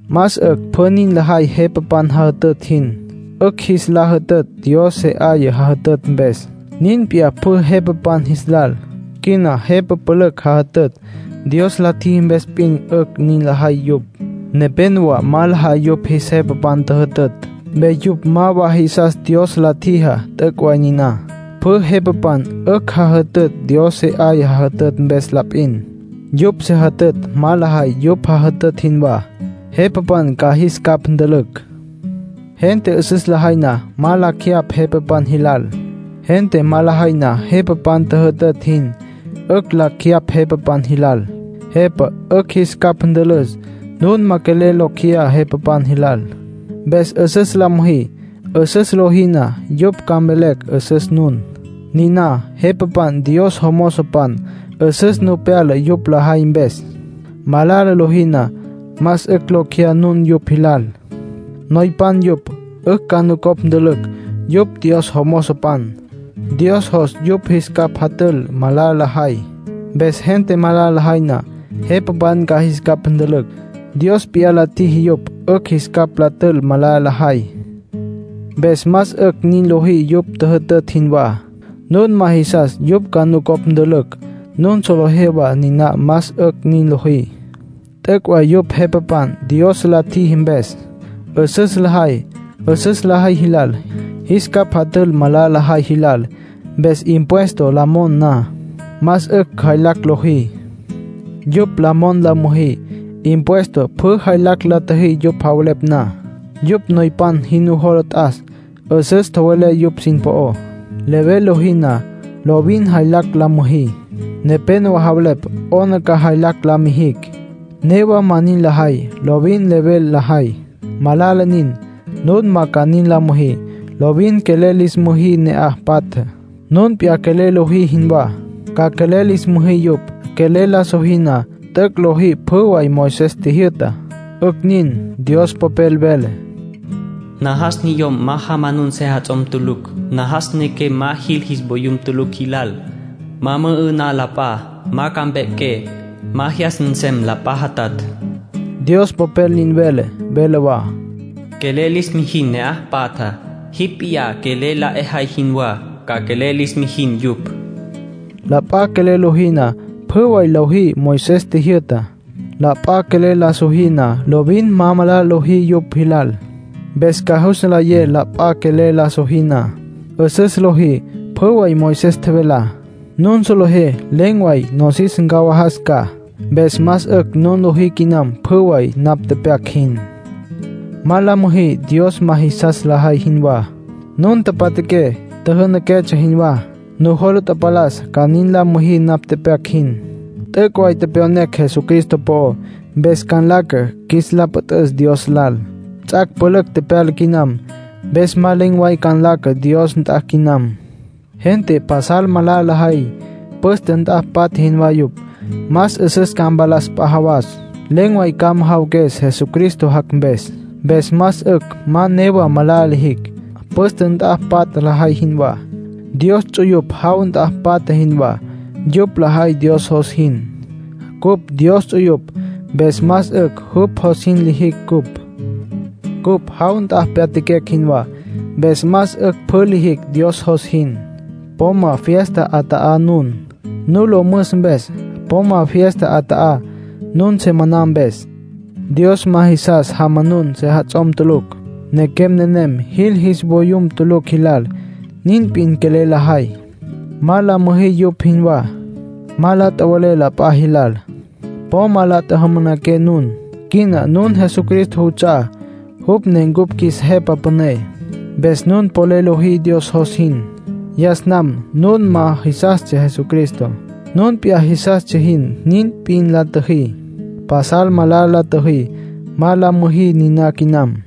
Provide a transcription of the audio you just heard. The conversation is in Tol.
Más 'ücj pjü nin lajay jepapan jajütütj jin. 'Ücj jis la jütütj Dios se 'aya jajütütj mpes. Nin p'iyá pjü jepapan jis lal. Quina jepa pülücj jajütütj. Dios la tjiji mpes p'in 'ücj nin lajay yupj. Nepénowa ma lajay yupj jis jepapan tjüjütütj. Mpes yupj ma wa jisas Dios la tjijá. T'üc' way niná; pjü jepapan 'ücj jajütütj Dios se 'aya jajütütj mpes la p'in. Yupj se jütütj ma lajay yupj jajütütj jinwá, jepapan ca jis capj ntülücj. Gente 'üsüs lajay na, ma lacj jeyapj jepapan jilal. Gente ma lajay na jepapan tjüjütütj jin, 'ücj lacj jeyapj jepapan jilal; jepa 'ücj jis capj ntülüs. Nun ma quelel locj jeyá jepapan jilal, mpes 'üsüs la müjí. 'Üsüs lojí na, yupj ca mvelecj 'üsüs nun. Niná jepapan Dios jomozopan. 'Üsüs nu pyala yupj lajay mpes. Malala lojí na, más 'ücj locj jeyá nun yupj jilal. Noypan yupj, 'ücj ca nucopj ntülücj. Yupj Dios jomozopan. Dios jos yupj jis capj jatül malala lajay. Mpes gente malala lajay na, jepapan ca jis capj ntülücj. Dios p'iyá la tjiji yupj 'ücj jis capj la tül malala lajay. Mpes más 'ücj nin lojí yupj tjüjütütj jinwá. Nun ma jisas yupj ca nucopj ntülücj. Nun solejé wa niná más 'ücj nin lojí. T'üc' way yupj jepapan, Dios la tjiji mpes. 'Üsüs lajay 'üsüs lajay jilal. Jis capj jatül malala lajay jilal. Mpes impuesto la mon na, más 'ücj jaylacj lojí. Yupj la mon la müjí. Impuesto pjü jaylacj la tjüjí yupj javelepj na. Yupj noypan jin nujola t'as; 'üsüs tjowelé yupj sin po'ó. Level lojí na, lovin jaylacj la müjí. Nepénowa javelepj 'ona ca jaylacj la mijicj; newa ma nin lajay, lovin level lajay. Malala nin. Nun ma ca nin la müjí. Lovin quelel lis müjí ne'aj patjá. Nun p'iyá quelel lojí jinwá, ca quelel lis müjí yupj. Quelel la sojí na, t'üc' lojí pjü way Moisés tjijyü'tá. 'Ücj nin. Dios Popel vele: “Najas niyom ma jamanun sejats'om tulucj. Najas nequem ma jil jis vayum tulucj jilal. Ma mü'ü'ná la p'a. Ma ca mpequem. Ma jyas nsem la p'a jatatj”, Dios Popel nin vele. Vele wa: “Quelel lis mijin ne'aj patjá. Jipj p'iyá quelel la 'ejay jinwá, ca quelel lis mijin yupj.” La p'a quelel lojí na, pjü way lojí Moisés tjijyü'tá. La p'a quelel la sojí na, lovin ma malala lojí yupj jilal. Mpes ca jus nlayé la p'a quelel la sojí na, 'üsüs lojí pjü way Moisés tjevelá. Nun solejé len̈ way nosis ncawajas ca. Mpes más 'ücj nun lojí quinam pjü way napj tepyac jin. Ma la müjí Dios ma jisas lajay jinwá. Nun tapatjaqué, tjijinaquetsja jinwá. Nujola tapalas ca nin la müjí napj tepyac jin. T'üc' way tepyonecj Jesucristo po'ó. Mpes ca nlaca qjuis la püt'üs Dios lal. Ts'ac' pülücj tepyala quinam, mpes más len̈ way ca nlaca Dios nt'a quinam. Gente pasal malala lajay. Püste nt'a patja jinwá yupj. Más 'üsüs ca mpalas p'a jawas. Len̈ way ca majawaques, Jesucristo jac' mpes. Mpes más 'ücj ma newa malala lijicj, püste nt'a patja lajay jinwá. Dios ts'uyupj jaw nt'a patja jinwá; yupj lajay Dios jos jin. Cupj Dios ts'uyupj, mpes más 'ücj jupj jos jin lijicj cupj. Cupj jaw nt'a pyatjaquecj jinwá, mpes más 'ücj pjü lijicj Dios jos jin. Po ma fiesta 'ata'a nun, nu lo müs mpes. Po ma fiesta 'ata'a, nun se maná mpes. Dios ma jisas jamanun sejats'om tulucj. Nequem nenem jil jis voyum tulucj jilal. Nin p'in quelel lajay. Ma la müjí yupj jinwá. Ma la tjowe'lé la p'a jilal. Po ma la tjajamanaqué nun. Quina nun Jesucristo juts'a'á, jupj ne cupj qjuis Jepa Püné. Mpes nun polel lojí Dios jos jin. Yas nam nun ma jisastsja Jesucristo. Nun p'iyá jisastsja jin, nin p'in la tjüjí. Pasal malala la tjüjí. Ma la müjí niná quinam.